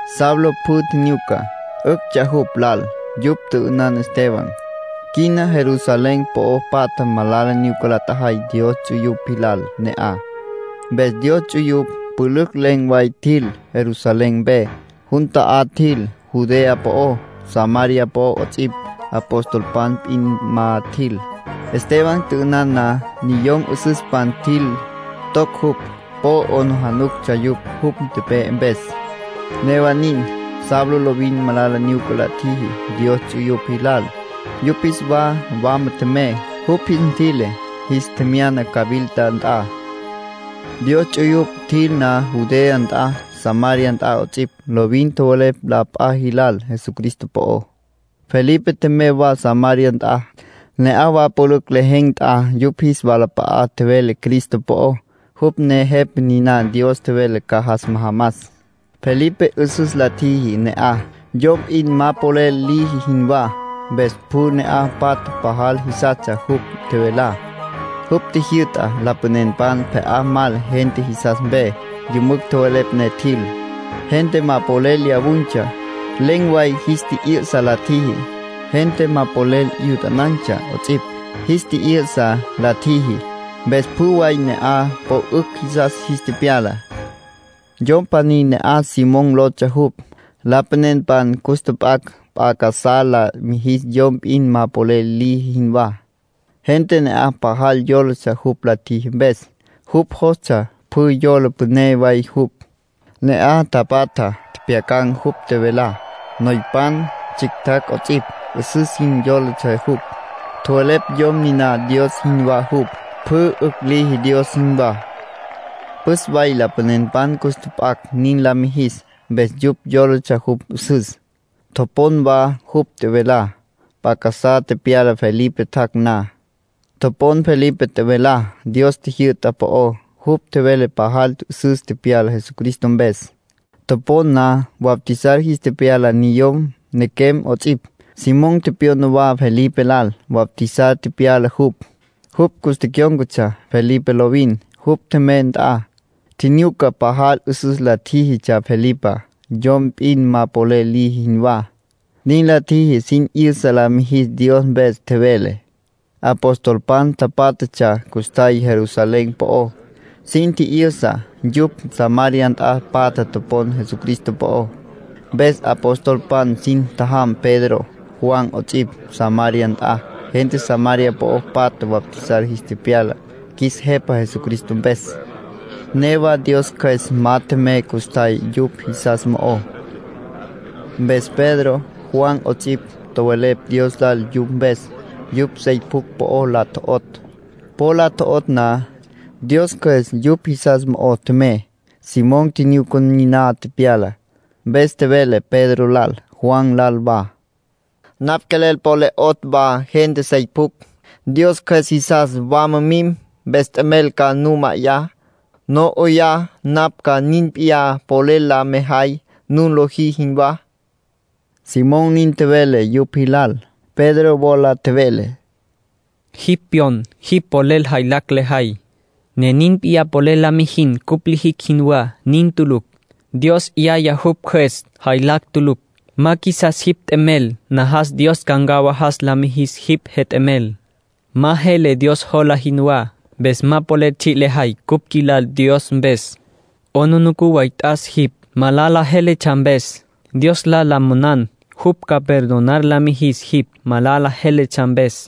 Saulo pjü tjinyuca. 'Üctsja jupj lal yupj tjü'ünan Esteban. Quina Jerusalén po'o patja malala nyuca la tjajay Dios ts'uyupj jilal ne'aj. Mpes Dios ts'uyupj pülücj len̈ way tjil Jerusalén mpe. Jun ta'á tjil Judea po'ó, Samaria po'ó 'ots'ipj. Apostolpan p'in ma tjil. Esteban tjü'ünan na, niyom 'üsüspan tjil, toc jupj. Po 'aplijílatsja yupj jupj tepe'e mpes. Newa nin, Saulo lovin malala nyuca la tjiji Dios ts'uyupj jilal. Yupj jis wa wama tjemey. Jupj jis ntjüi'le, jis tjemyana cawilta nt'a. Dios ts'uyupj tjil na Judea nt'a, Samaria nt'a 'ots'ipj, lovin tjowelepj la p'a jilal Jesucristo po'ó. Felipe tjemey wa Samaria nt'a. Ne'aj wa pülücj lejen̈ nt'a yupj jis walap'a'a tjevele Cristo po'ó, jupj ne Jepa niná Dios tjevele ca jas majamas. Felipe 'üsüs la tjiji ne'aj, yom p'in ma polel liji jinwá, mpes pjü ne'aj patja pajal jisastsja jupj tjevelá. Jupj tjijyü'ta lapanenpan pje'á mal gente jisas mpe. Yümücj tjowelepj ne tjil. Gente ma polel lyawun̈tsja, len̈ way jis tji'yü'sa la tjiji. Gente ma polel 'yutanan̈tsja 'ots'ipj, jis tji'yü'sa la tjiji. Mpes pjü way ne'aj po 'ücj jisas jis tepyala. Yom pjaní ne'aj Simón lotsja jupj. Lapanenpan cus tjap'acj p'a casá la mijis yom p'in ma polel liji jinwá. Gente ne'aj pajal yólatsja jupj la tjiji mpes. Jupj jostsja pjü yola püné way jupj. Ne'aj tapatja tjepjyacan̈ jupj tjevelá. Noypan, tsjictjacj 'ots'ipj, 'üsüs jin yólatsja jupj. Tjowelepj yom niná Dios jinwá jupj, pjü 'ücj liji Dios jinwá. Püs way lapanenpan cus tjap'acj nin la mijis, mpes yupj yólatsja jupj 'üsüs, topon wa jupj tjevelá. P'a casá tepyala Felipe tjac' na. Topon Felipe tjevelá Dios jyü'ta po'ó. Jupj tjevele pajal 'üsüs tepyala Jesucristo mpes. Topon na, bautizar jis tepyala niyom, nequem 'ots'ipj. Simón tepyona wa Felipe lal. Bautizar tepyala jupj. Jupj cus tecyón̈catsja Felipe lovin, jupj tjemey nt'a. Tjinyuca pajal 'üsüs la tjíjitsja Felipá, yom p'in ma polel liji jinwá. Nin la tjiji sin 'yüsa la mijis Dios mpes tjevele. Apostolpan tapátjatsja custjay Jerusalén po'ó. Sin tji'yüsa yupj Samaria nt'a patja topon Jesucristo po'ó. Mpes apostolpan sin tjajam Pedro, Juan 'ots'ipj, Samaria nt'a. Gente Samaria po'o patja bautizar jis tepyala qjuis Jepa Jesucristo mpes. Newa Dios Cjües ma tjemey custjay yupj jisas mo'ó. Mpes Pedro, Juan 'ots'ipj, tjowelepj Dios lal yupj mpes. Yupj sey pjucj po la tjo'otj. Po la tjo'otj na, Dios Cjües yupj jisas mo'o tjemey. Simón tjinyuca niná tepyalá. Mpes tjevele Pedro lal, Juan lal wa: —Napj quelel po le 'otj wa gente sey pjucj, Dios Cjües jisas wama mim. Mpes t'emel ca nu ma'ayá, no 'oyá napj ca nin p'iyá polel la mejay nun lojí jinwá —Simón nin tjevele yupj jilal. Pedro wola tjevele: —Jipj pyon jipj polel jaylacj lejay, ne nin p'iyá polel la mijin cupj lijicj jinwá. Nin tulucj. Dios 'yaya jupj Cjües, jaylacj tulucj. Ma qjuisas jipj t'emel. Najas Dios ca ncawajas la mijis jipj jet'emel. Ma jele Dios jola jinwá. Mpes ma polel tsji' lejay cupj qjuilal Dios mpes. 'Aplijila way t'as jipj, malala jéletsja mpes. Dios lal la monan jupj ca perdonar la mijis jipj, malala jéletsja mpes.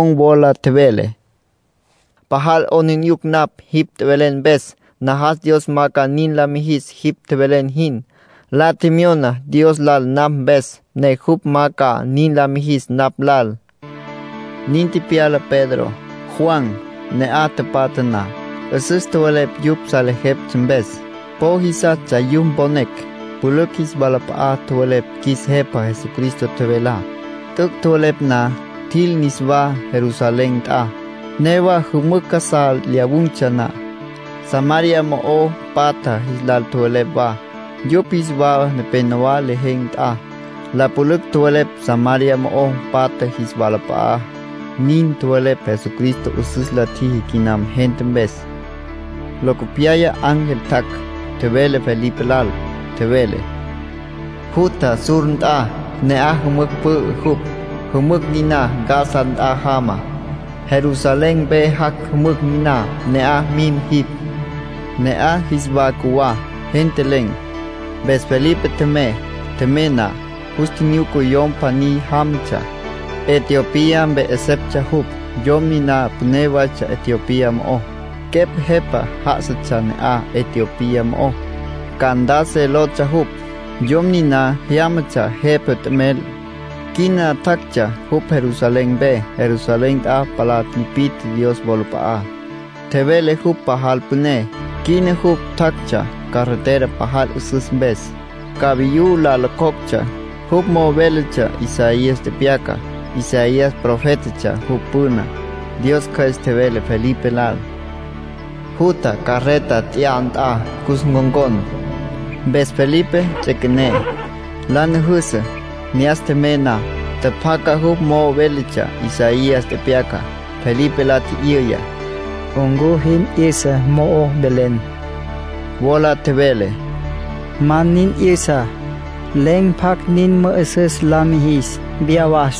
Simón wola tjevele: —Pajal 'aplijila napj jipj tjevelen mpes. Najas Dios ma ca nin la mijis jipj tjevelen jin. La tjemyona Dios lal napj mpes, ne jupj ma ca nin la mijis napj lal —nin tjevele. Nin tepyala Pedro, Juan, ne'aj tapatja na. 'Üsüs tjowelepj yupj salejeptsja mpes. Po jisastsja yupj mponecj. Pülücj jis walap'a'a tjowelepj qjuis Jepa Jesucristo tjevelá. T'üc' tjowelepj na, tjil niswá Jerusalén nt'a. Newa jümücj casá lyawun̈tsja na, Samaria mo'o patja jis lal tjowelepj wa, yupj jis wa nepénowa lejen̈ nt'a. La pülücj tjowelepj Samaria mo'o patja jis walap'a'á; nin tjowelepj Jesucristo 'üsüs la tjiji quinam gente mpes. Locopyaya ángel tjac', tjevele Felipe lal. Tjevele: “Jutja sur nt'a. Ne'aj jümücj pü'ü jupj, jümücj niná Gaza nt'a jama. Jerusalén mpe jac' jümücj niná. Ne'aj mim jipj”, ángel nin tjevele. Ne'aj jis wa cjuwá, gente len̈. Mpes Felipe tjemey. Tjemey na, jus tjinyuca yom pjaní jámatsja. Etiopía mpe 'eseptsja jupj. Yom niná püné waytsja Etiopía mo'ó. Quepj jepa já'asatsja ne'aj Etiopía mo'ó. Candace lotsja jupj. Yom niná jyámatsja jepa t'emel. Quina tjactsja jupj Jerusalén mpe. Jerusalén nt'a palá tipi'tje Dios wolap'a'á, tjevele jupj pajal püné. Quina jupj tjactsja carreta pajal 'üsüs mpes, cavayú la locjoctsja. Jupj mo'o véletsja Isaías tepyacá, Isaías profétatsja jupj püna. Dios Cjües tjevele Felipe lal: “Jutja carreta tya'a nt'a, cus ncon̈con”. Mpes Felipe ts'üequené, la nüjüsü. Ne'as tjemey na, tjapjaca jupj mo'o véletsja Isaías tepyacá. Felipe la tji'yüya: —¿Ncu jin 'yüsa mo'o velen? Wola tjevele: —Ma nin 'yüsa. Len̈ pjacj nin mü'üsüs la mijis. Viyá was,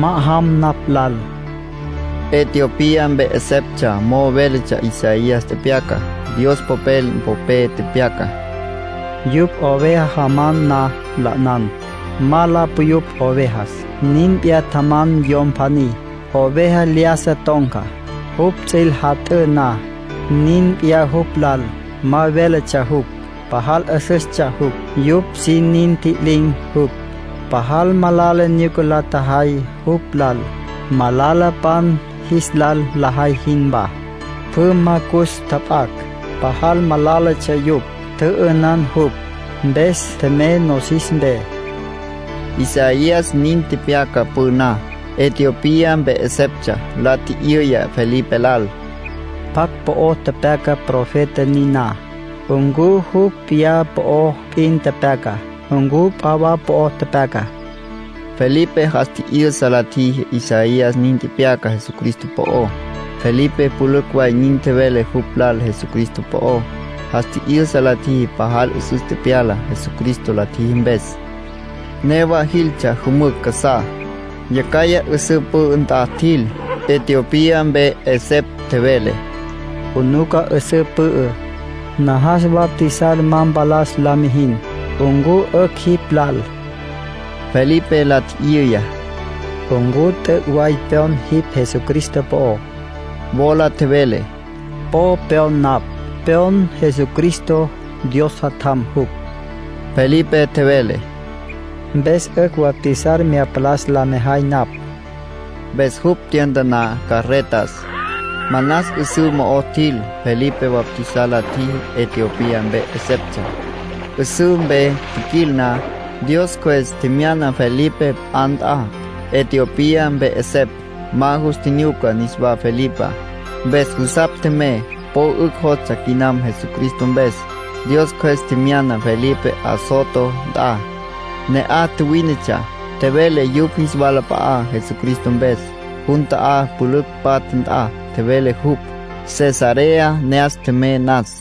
ma'ajam napj lal —nin tjevele Felipe lal. Etiopía mpe 'eseptsja mo'o véletsja Isaías tepyacá, Dios Popel popé. Tepyaca: “Yupj oveja jaman na la 'ünan, ma la puyupj ovejas. Nin p'iyá tjaman yom pjaní. Oveja lyájasa ton̈ca, jupj ts'üil jat'ǘ na. Nin p'iyá jupj lal, ma véletsja jupj. Pajal 'üsüstsja jupj; yupj sin nin ntji'lin̈ jupj. Pajal malala nyuca la tjajay jupj lal, malalapan jis lal lajay jinwá. Pjü ma cus tjap'acj. Pajal malálatsja yupj. Tjü'ünan jupj, mpes tjemey nosis mpe.” Isaías nin tepyaca püná. Etiopía mpe 'eseptsja la tji'yüya Felipe lal: —¿Pjacj po'o tepyaca profeta niná? ¿Ncu jupj p'iyá po'o p'in tepyaca? ¿Ncu p'a wa po'o tepyaca? —nin la tji'yüya. Felipe jas tji'yüsa la tjiji Isaías nin tepyaca Jesucristo po'ó. Felipe pülücj way nin tjevele jupj lal Jesucristo po'ó. Jas tji'yüsa la tjiji pajal 'üsüs tepyala Jesucristo la tjiji mpes. Newa jiltsja jümücj casá. Yacjaya 'üsǘ pü'ü nt'a tjil. Etiopía mpe 'esepj tjevele: —'Unuca, 'üsǘ pü'ü. Najas bautizar ma palas la mijin. ¿Ncu 'ücj jipj lal? —la tji'yüya. Felipe la tji'yüya: —¿Ncu t'üc' way pyon jipj Jesucristo po'ó? Wola tjevele: —Po pyon napj. Pyon Jesucristo Dios Jatjam jupj. Felipe tjevele: —Mpes 'ücj bautizar mya palas la mejay napj. Mpes jupj tyantaná carretas. Manas 'üsǘ mo'o tjil. Felipe bautizar la tjiji Etiopía mpe 'eseptsja. 'Üsǘ mpe tjiquil na, Dios Cjües tjemyana Felipe p'a nt'a. Etiopía mpe 'esepj ma jus tjinyuca niswá Felipá. Mpes jusapj tjemey. Po 'ücj jostsja quinam Jesucristo mpes. Dios Cjües tjemyana Felipe Azoto nt'a. Ne'aj tjuwínetsja, tjevele yupj jis walap'a'á Jesucristo mpes. Jun ta'á, pülücj patja nt'a, tjevele jupj, Cesarea ne'as tjemey nas.